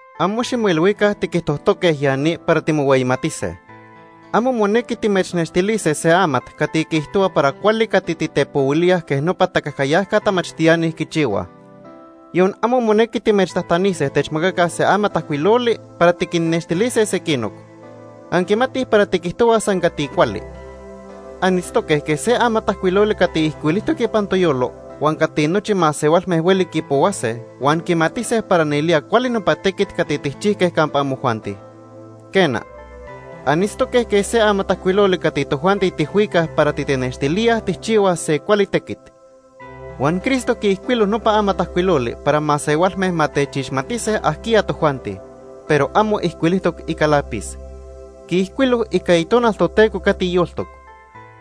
Amo ximoilhuica tiquijtojtoque ya ni para timohueyimatise. Amo monequi timechnextilise se amat cati quiijtohua para cuali cati titepohuilíaj quej nopa tacajcayajca tamachtiani quichihuaj. Yon amo monequi timechtajtanise techmacaca se amatajcuiloli para tiquinnextilise sequinoc. Anquimatij para tiquijtohuaj san cati cuali. Anitztoque quej se amatajcuiloli cati ijcuilijtoc ipan toyolo huan cati nochi masehualme hueli quipohuase huan quimatise para nelía cuali nopa tequit cati tijchijque campa amojuanti. Quena, anitztoque quej se amatajcuiloli cati tojuanti tijhuicaj para titenextilíaj tijchihuaj se cuali tequit. Huan Cristo quiijcuilo nopa amatajcuiloli para masehualme ma techixmatise ajquiya tojuanti, pero amo ijcuilijtoc ica lápiz. Quiijcuilo ica Itonal Toteco cati yoltoc.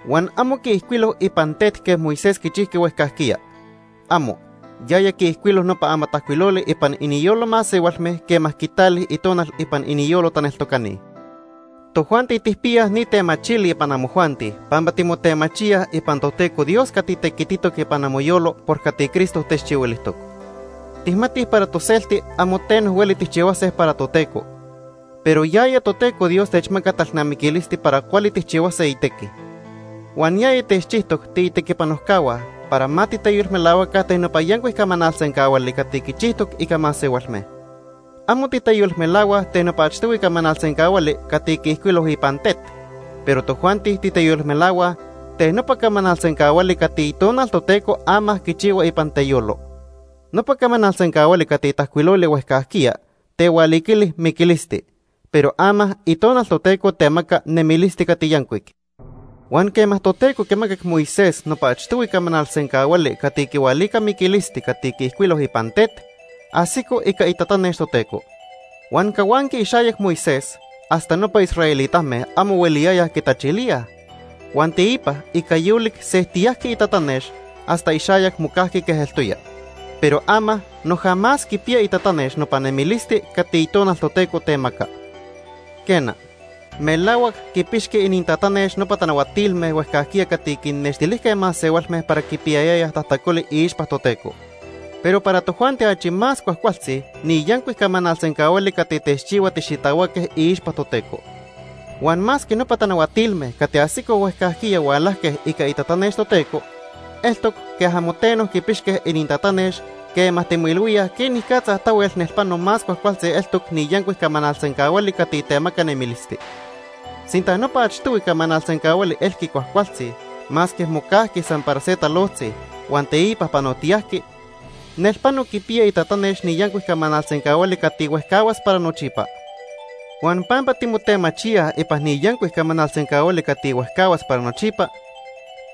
Huan amo quiijcuilo ipan tet quej Moisés quichijqui huejcajquiya. ¡Amo! Yaya quiijcuilo nopa amatajcuiloli ipan iniyolo masehualme quema quitali Itonal ipan iniyolo taneltocani. Tojuanti tijpiyaj ni temachili ipan amojuanti pampa timotemachíaj ipan Toteco Dios cati tequititoc ipan amoyolo por cati Cristo techchihuilijtoc. Tijmatij para toselti amo teno hueli tijchihuase para Toteco, pero yaya Toteco Dios techmaca talnamiquilisti para cuali tijchihuase itequi. Huan yaya techchijtoc tiitequipanojcahua para ma titeyolmelahuaca ten nopa yancuic camanal sencahuali cati quichijtoc ica masehualme. Amo titeyolmelahuaj ten nopa achtohui camanal sencahuali cati quiijcuilo ipan tet, pero tojuanti titeyolmelahuaj ten nopa camanal sencahuali cati Itonal Toteco ama quichihua ipan teyolo. Nopa camanal sencahuali cati tajcuiloli huejcajquiya tehualiquili miquilisti, pero ama Itonal Toteco temaca nemilisti cati yancuic. Huan quema Toteco quimacac Moisés nopa achtohui camanal sencahuali cati quihualica miquilisti cati quiijcuilo ipan tet, ajsico ica itatanex Toteco. Huan cahuanqui ixayac Moisés hasta nopa israelitame amo hueliyayaj quitachilíaj, huan teipa ica yolic sejtiyajqui itatanex hasta ixayac mocajqui quej eltoya. Pero ama noja más quipiya itatanex nopa nemilisti cati Itonal Toteco temaca. Quena, melahuac quipixqui inintatanex nopa tanahuatilme huejcajquiya cati quinnextilijque masehualme para quipiyayayaj tajtacoli iixpa Toteco. Pero para tojuanti achi más cuajcualtzi ni yancuic camanal sencahuali cati techchihua tixitahuaque iixpa Toteco. Huan masque nopa tanahuatilme cati ajsicoj huejcajquiya hualajque ica itatanex Toteco, eltoc quej amo teno quipixque inintatanex quema timoilhuíaj quenicatza tahuel nelpano más cuajcualtzi eltoc ni yancuic camanal sencahuali cati temaca nemilisti. Sinta nopa achtohui camanal sencahuali elqui cuajcualtzi masque mocajqui san para se talojtzi huan teipa panotiyajqui, nelpano quipiya itatanex ni yancuic camanal sencahuali cati huejcahuas para nochipa. Huan pampa timotemachíaj ipan ni yancuic camanal sencahuali cati huejcahuas para nochipa,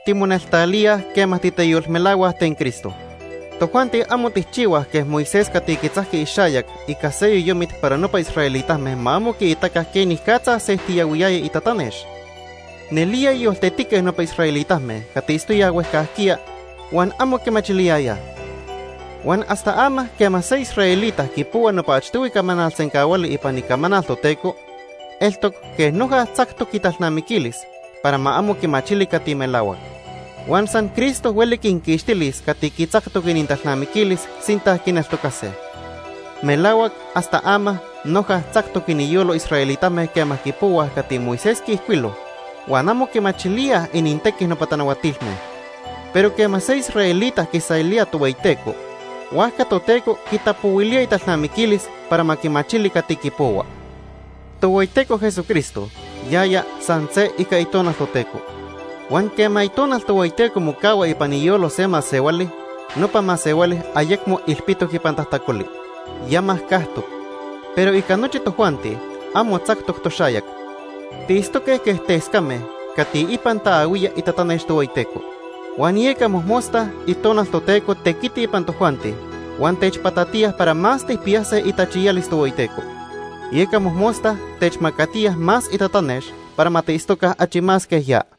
timoneltalíaj quema titeyolmelahuaj ten Cristo. Tojuanti amo tijchihuaj quej Moisés cati quitzajqui ixayac ica se yoyomit para nopa israelitame ma amo quiitaca quenicatza sejtiyahuiyaya itatanex. Nelía yoltetique nopa israelitame cati itztoyaj huejcajquiya huan amo quimachiliyayaj. Huan hasta ama quema se israelita quipohua nopa achtohui camanal sencahuali ipan Icamanal Toteco, eltoc quej noja tzactoc italnamiquilis para ma amo quimachili cati melahuac. Huan san Cristo hueli quinquixtilis cati quitzactoc inintalnamiquilis sinta quineltocase. Melahuac hasta ama noja tzactoc iniyolo israelitame quema quipohuaj cati Moisés quiijcuilo huan amo quimachilíaj inintequi nopa tanahuatilme. Pero quema se israelita quiselía Tohueyiteco, huajca Toteco quitapohuilía italnamiquilis para ma quimachili cati quipohua. Tohueyiteco Jesucristo yaya san se ica Itonal Toteco, huan quema Itonal Tohueyiteco mocahua ipan iyolo se masehuali, nopa masehuali ayecmo ilpitoc ipan tajtacoli, ya majcajtoc. Pero ica nochi tojuanti, amo tzactoc toxayac. Tiitztoque quej tescame cati ipan taahuía itatanex Tohueyiteco. Huan yeca mojmosta Itonal Toteco tequiti ipan tojuanti huan techpatatiya para más tijpiyase itachiyalis Tohueyiteco. Yeca mojmosta techmacatiya más itatanex para ma tiitztoca achi más quej ya.